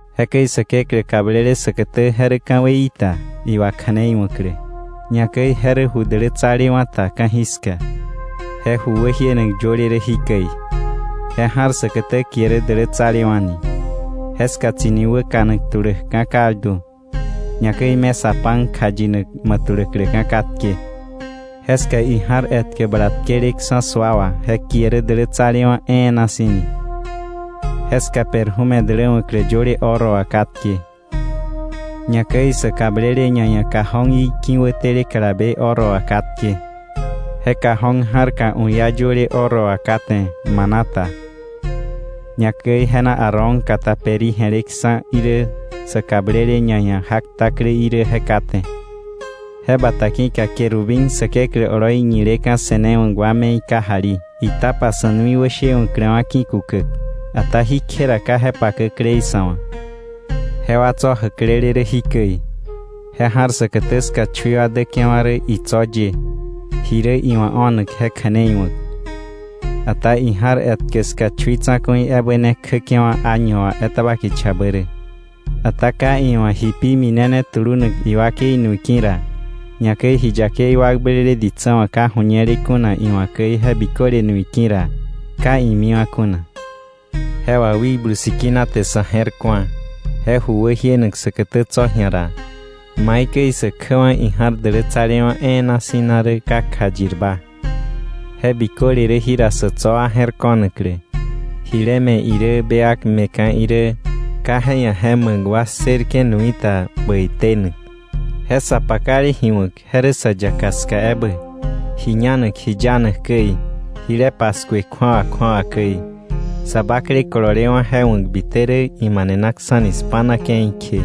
Jekäi Säkeklä kablele säkätä, je rä ka̱weií ta iwakja̱neiwa̱klä, ñakäi je rä ju dälätsalewa̱ ta ka̱jiska. Je ju wäjienak yöle rä jikäi: Je ja̱r säkätä kie rä Dälätsalewa̱ ni, jeska tsi̱ni wäkanak tuläkka̱ kaldu, ñakäi mesa pan kjayinak ma̱ tuläkläka̱ katke. Jeska ija̱r etkä bala tkeleksa̱ sua wà je kie rä Dälätsalewa̱ E̱e̱na Si̱ ni. Jeska perfume däläwa̱klä yöle oro wà katke. Ñakäi sä kablele ñaia̱ cajón í ki̱wätele kalabe oro wà katke, je cajón ja̱rka u̱ iá yöle oro wà kate maná ta, ñakäi je na Aarón kata peri je̱leksa̱ irä, sä kablele ñaia̱ jak takläí irä je kate. Je bata ki̱ka querubín Säkeklä oloi ñileka̱ se̱newa̱k wa me̱i kajali, itapa sa̱ nui wäshewa̱kläwa̱ ki̱kukäk. Ata jí kje ra ka je pakäklei sa̱ wa̱. Jewa tso̱ jäklele rä jikäi. Je ja̱r säkätä ska chui wa däke̱wa̱ rä itso̱ ye, ji rä iwa̱ o̱nak je kja̱nei wa̱k. Ata ija̱r etkä ska chui tsa̱ku̱i ebä ne kjäke̱wa̱ año wà etaba kichabä rä, ata ka iwa̱ ji pi minene tulunak iwakei nui ki̱ ra, ñakäi ji yakei wakblele ditsä wa̱ ka ju̱ñele kuna iwa̱ käi je biköle nui ki̱ ra, ka imiwa̱ kuna. Je wà Wikblu Sikina te sa̱ je̱r ku̱a je ju wäjienak säkätä tso̱ ji̱a ra, maikäi sä kjäwa̱ ija̱r Dälätsalewa̱ E̱e̱na Si̱ na rä ka kjayirba. Je biköle rä jira sa̱ tso̱ wa je̱r ko̱naklä, jile me̱ irä bewak me̱ka̱ irä, ka je ia̱ je ma̱k wa ssërke̱ nui ta bäi tenak. Je sa pakale ji wa̱k, je rä sa yaka ska ebä, ji ñanak ji yanak käi, jile paskue kju̱awa kju̱awa käi. Sa bakle kololewa̱ je wa̱k bite rä imanenaksa̱ni spa̱na ke̱i kje.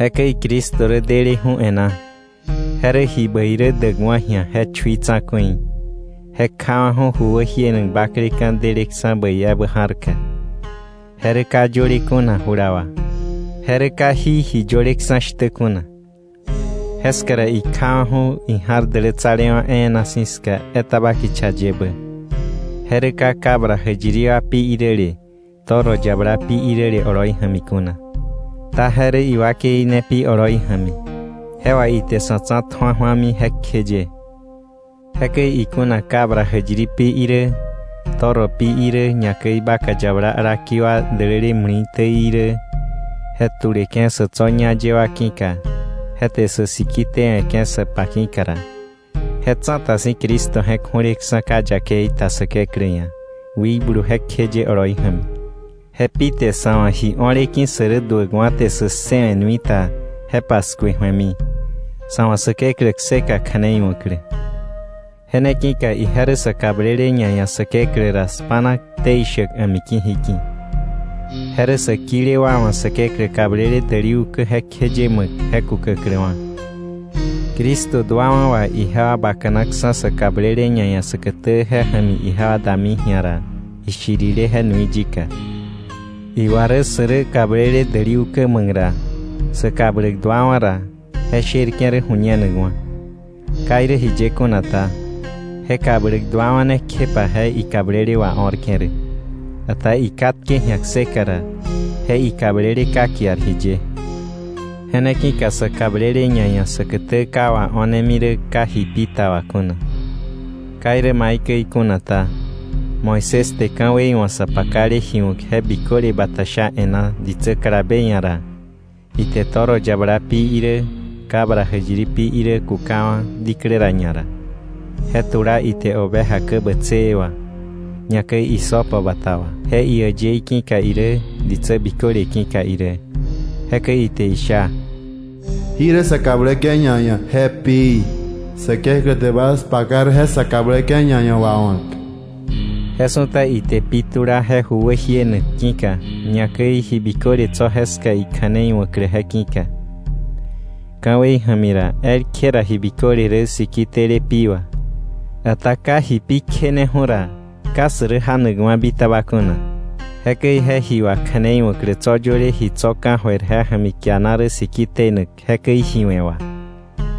Jekäi Cristo rä deleju̱ e̱ná. Je rä ji bäi rä däkwa̱ ji̱a je chui tsa̱ku̱i. Je kjawa̱ju ju wäjienak bakleka̱ deleksa̱ bäi ebä ja̱rka, je rä ka yöle kuna jula wà, je rä ka jí ji yöleksa̱ shtä kuna, jeska ra ikjawa̱ju̱ ija̱r Dälätsalewa̱ E̱e̱na Si̱ ska etaba kicha yebä, je rä ka cabra jäyiri wa pi iräle toro yabala pi iräle oloi ja̱mi kuna, ta je rä iwakei ne pi oloi ja̱mi, je wà ite sa̱ tsa̱tju̱a ju̱ami jekjeye. Jekäi ikuna cabra jäyiri pi irä, toro pi irä, ñakäi vaca yabala alaki wa däläle muli̱täí irä, je tuleke̱ sa̱ tso̱ ñá ye wa ki̱ka, je te sä siki tewe̱ke̱ sa pa ki̱ka ra, je tsa̱ta si̱ Cristo je̱k ju̱leksa̱ ka yakei ta Säkeklä ia̱ Wikblu jekjeye oloi ja̱mi, je pi te sa̱ wa̱ ji o̱le ki̱ sä rä duäkwa̱ te sä ssëwe̱ nui ta, je paskue ju̱emi, sa̱ wa̱ Säkeklä kseka kja̱nei wa̱klä. Je ne ki̱ka ije rä sa kablele ñaia̱ Säkeklä ra spa̱na ktei shäk a̱miki̱ jiki̱. Je rä sä kile wa wa̱ Säkeklä kablele däli ukä jekjeye ma̱k je kukäkläwa̱. Cristo duawa̱ wà ijewa bakanaksa̱ sa kablele ñaia̱ säkätä je ja̱mi ijewa dami ji̱a ra ishirile, je nui yika. Iwa rä sä rä kablele däli ukä ma̱k ra, sä kabläk duawa̱ ra, je sherke̱ rä ju̱ñenakwa̱. Ka irä jiye kuna ta, je kabläk duawa̱ ne kjepa je ikablele wao̱rke̱ rä. Ata ikatke ji̱a kseka ra, je ikablele ka kiar jiye. Je ne ki̱ka sa kablele ñaia̱ säkätä ka wao̱nemi rä ka ji pi ta wà kuna. Ka irä maikäi kuna ta, Moisés te ka̱wei wa̱ sa pakale ji wa̱k je biköle bata sha e̱ná ditsä kalabe ia̱ ra, ite toro yabala pi irä, cabra jäyiri pi irä kukawa̱ diklä ra ñara, je tula ite oveja kä bätsëë wà, ñakäi hisopo bata wà, je iäyëí ki̱ka irä, ditsä biköle ki̱ka irä. Jekäi ite isha: “Jí rä sa kabläke̱ ñaia̱ je pií. Säkeklä te bas paka rä je sa kabläke̱ ñaia̱ wawa̱k.” Je su̱ta ite pi tula je ju wäjienak ki̱ka, ñakäi ji biköle tso̱ jeska ikja̱nei wa̱klä je ki̱ka. Ka̱wei ja̱mi ra, elkje ra ji biköle rä siki tele pi wà, ata ka ji pi kjeneju̱ ra, ka sä rä janakwa̱ bitaba kuna. Jekäi je ji wakja̱neiwa̱klä tso̱ yöle ji tso̱ ka̱jöir je ja̱mi kiana rä siki tenak jekäi ji we̱ wà,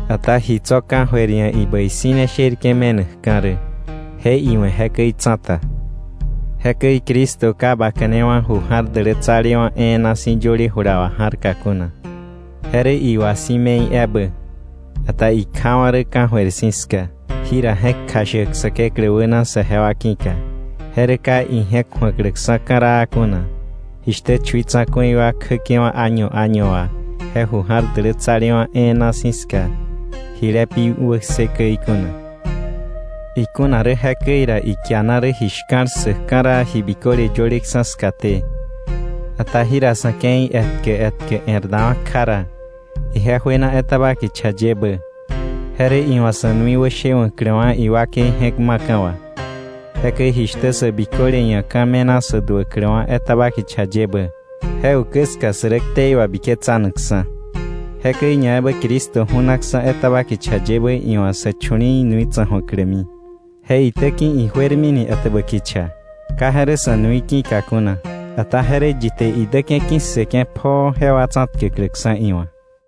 ata ji tso̱ ka̱jöir ia̱ ibäi si̱ ne sherke̱ me̱nakka̱ rä, je iwe̱ jekäi tsa̱ta. Jekäi Cristo ka baka̱newa̱ ju ja̱r dälätsalewa̱ e̱e̱na si̱ yöle jula wà ja̱rka kuna. Je rä iwa si̱ me̱i ebä. Ata ikjawa̱ rä ka̱jöir si̱ ska, jira je̱k kjashäk Säkeklä wäna saje wa ki̱ka, je rä ka ije̱k ju̱akläksa̱ ka̱raa kuna, jishtä chui tsa̱ku̱i wa kjäke̱wa̱ año año wà je Ju Ja̱r Dälätsalewa̱ E̱e̱na Si̱ ska, jile pi wäkse käi kuna. Ikuna rä jekäi ra, ikiana rä ji shka̱l ssäk ka̱raa ji biköle yöleksa̱ skaté, ata jira sa̱ ke̱i etkä etkä e̱r dawa̱ kja ra, ije juena etaba kicha yebä, je rä iwa̱ sa̱ nui wäshewa̱kläwa̱ iwakei je̱k ma̱ka̱ wà. Jekäi jishtä sä biköle ia̱ ka̱ me̱na sä duäkläwa̱ etaba kicha yebä, je ukä ska sä rä ktei wabiketsanakksa̱, jekäi ñaebä Cristo ju̱naksa̱ etaba kicha yebä iwa̱ sä chu̱li̱i̱ nui tsa̱ju̱aklämi, je itäki̱ ijuermini etäbä kicha, ka je rä sa̱ nui ki̱ka kuna, ata je rä yi te idäke̱ ki̱ssëke̱ pjoo jewa tsa̱tkäkläksa̱ iwa̱.